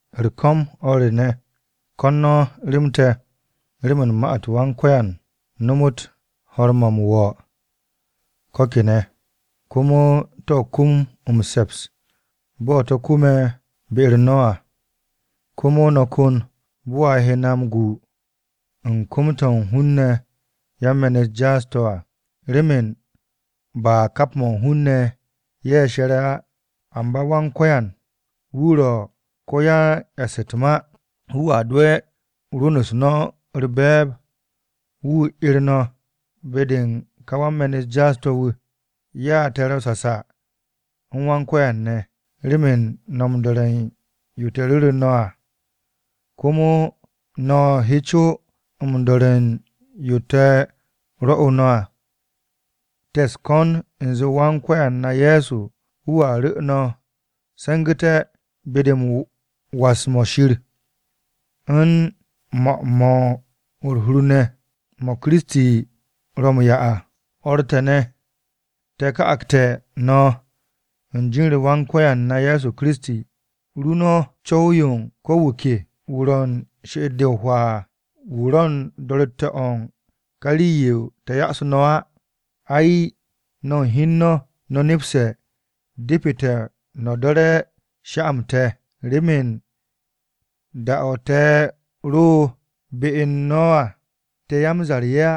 U̱r-ko̱m o̱r re ne̱, ko̱n no̱ rem te̱ remen ma-u̱t Wan-Ko̱yan nomot ho̱r-mo̱ m-wo̱ ko̱ kene̱, komo to̱ kum m-se̱ps bo̱ to̱ kume̱ be-u̱r no̱ à. Komo no̱ ko̱n bo̱ a he na m-gu u̱n kom-to̱ u̱n hun-ne̱ yan-me̱n-u̱t jaas-to̱ à, remen ba kap mo̱ u̱n hun-ne̱ ye̱ she̱re̱ á. Amba Wan-Ko̱yan wu̱ ro̱ ko-yan-e̱ss u̱t-ma, wu̱a dowe̱ rwu̱n-u̱s no̱ u̱r-be̱e̱b, wu̱ 'er no̱ be-de u̱n ka wan-me̱n-u̱t jaas-to̱ wu̱. Ya te̱ ro̱ sasa u̱n Wan-Ko̱yan ne̱, remen no̱ m-do̱re̱ u̱n yo te̱ ru̱ru̱ no̱ à, komo no̱ he co m-do̱re̱ u̱n yo te̱ rwo̱'u̱ no̱ à. Te̱ u̱s-ko̱n u̱nze Wan-Ko̱yan na Ye̱so wu̱a ru̱ no̱ se̱ngu̱te̱, be-de u̱n was-mo̱ Shir, u̱n 'mo̱-mo̱ u̱r-hur ne̱ mo̱ Kiristi ro̱ m-'ya à. O̱r te̱ ne̱, te̱ ka'agte̱ no̱ u̱n jin-u̱r Wan-Ko̱yan na Ye̱so Kiristi, ru no̱ co̱w-yo u̱n ko̱ wu̱ ke, wu̱ ro̱ u̱n she'et-de o-hwaa à, wu̱ ro̱ u̱n do̱ro̱tte̱-o̱ u̱n ká rii-yo te̱ yoosu̱ no̱ á. Ai, no̱ u̱n hi u̱n no̱, no̱ nepse̱ depete̱ no̱ do̱re̱ sha-m te̱, remen da-o̱ te̱ ro be u̱n no̱ à, te̱ ya-m-zar-ye̱ á,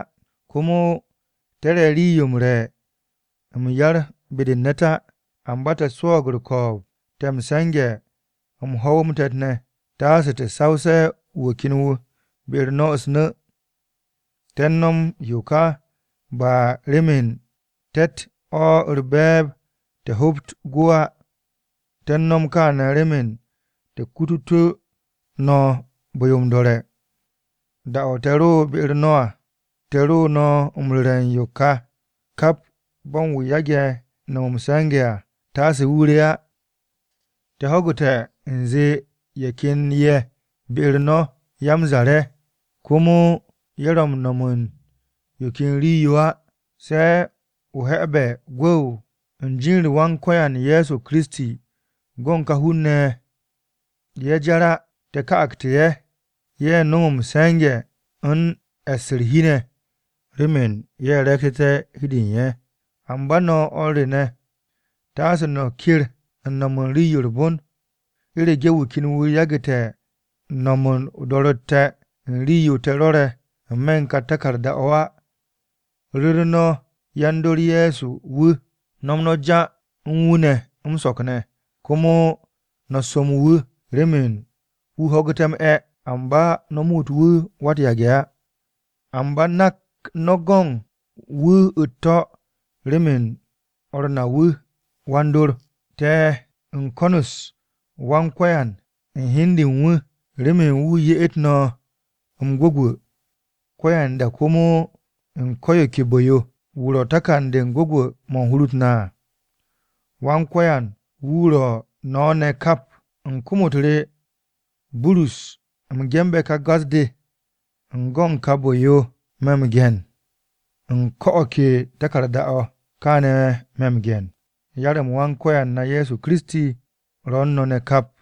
komo te̱ re̱ rii-yo m-re̱ m-yar be-de u̱n ne̱t á. Amba te̱ swo̱o̱g u̱r-ko̱o̱b, te̱ m-se̱nge̱ m-ho̱w, m-te̱t ne̱, taase te̱ sawse̱ wu̱ ken wu̱ be-u̱r no̱ u̱s-nu̱. Te̱ u̱n no̱m yo ka, ba remen te̱tt o̱ u̱r-be̱e̱b te̱ hobt gwu̱ á, te̱ u̱n no̱m kaane̱ remen te̱ kututú̱ no̱ bu̱-yo m-do̱re̱. Da-o̱ te̱ ro be-u̱r no̱ à, te̱ ro no̱ m-ru̱re̱ u̱n yo ka: “Kap bo̱n wu̱ yage̱ no̱m m-se̱nge̱ à taase wu̱ re á.” Te̱ ho̱gu̱te̱ u̱nze ye̱ ken ye̱ be-u̱r no̱ ya-m-zar-ye̱, komo ye̱ ro̱ m-no̱m u̱n yo ken rii-yo á se̱ o-he̱be̱ gwu̱w. U̱n jin-u̱r Wan-Ko̱yan Ye̱so Kiristi go̱n ka hun-ne̱ ye̱, ye̱ jar á. Te̱ ka'agte̱ ye̱, ye̱ no̱m m-se̱nge̱ u̱n e̱ss u̱r-hi ne̱, remen ye̱ re̱e̱gtu̱té̱ hi u̱n de u̱n ye̱. Amba no̱ o̱r re ne̱, taase no̱ ker u̱n no̱m u̱n rii-yo u̱r-bon. U̱rege̱ wu̱ ken wu̱ yagu̱te̱ no̱m o-do̱ro̱tte̱ u̱n rii-yo te̱ rwo̱re̱ n-me̱ u̱n ka taku̱rda-o̱ á, ru̱ru̱ no̱ yan-dor Ye̱so wu̱. Nom no̱ ja u̱n wu̱ ne̱ m-so̱k ne̱, komo no̱ som wu̱ remen wu̱ ho̱gu̱té̱ m-'e̱. Amba no̱ muut wu̱ wa-u̱t-yage̱ á, amba nak no̱ go̱n wu̱ u̱t-to̱ remen o̱r na wu̱ wan-dor. Te̱ u̱n ko̱n-u̱s Wan-Ko̱yan u̱n hi u̱n de u̱n wu̱, remen wu̱ ye'et no̱ m-gwu̱gwu̱ ko̱yanda komo u̱n ko̱ yo ke bu̱-yo. Wu̱ ro̱ takan-de u̱n gwu̱gwu̱-mo̱ u̱n hur-u̱t na à. Wan-Ko̱yan wu̱ ro̱ u̱n no̱ ne̱ kap. U̱n kom-u̱t re, Burus, u̱m ge̱nbe̱ ka gas-de. U̱n go̱n ka bu̱-yo me̱ m-ge̱n u̱n ko̱ o̱ ke taku̱rda-o̱. Kaane̱ me̱ m-ge̱n. Yar-m Wan-Ko̱yan na Ye̱so Kiristi ro̱ u̱n no̱ ne̱ kap!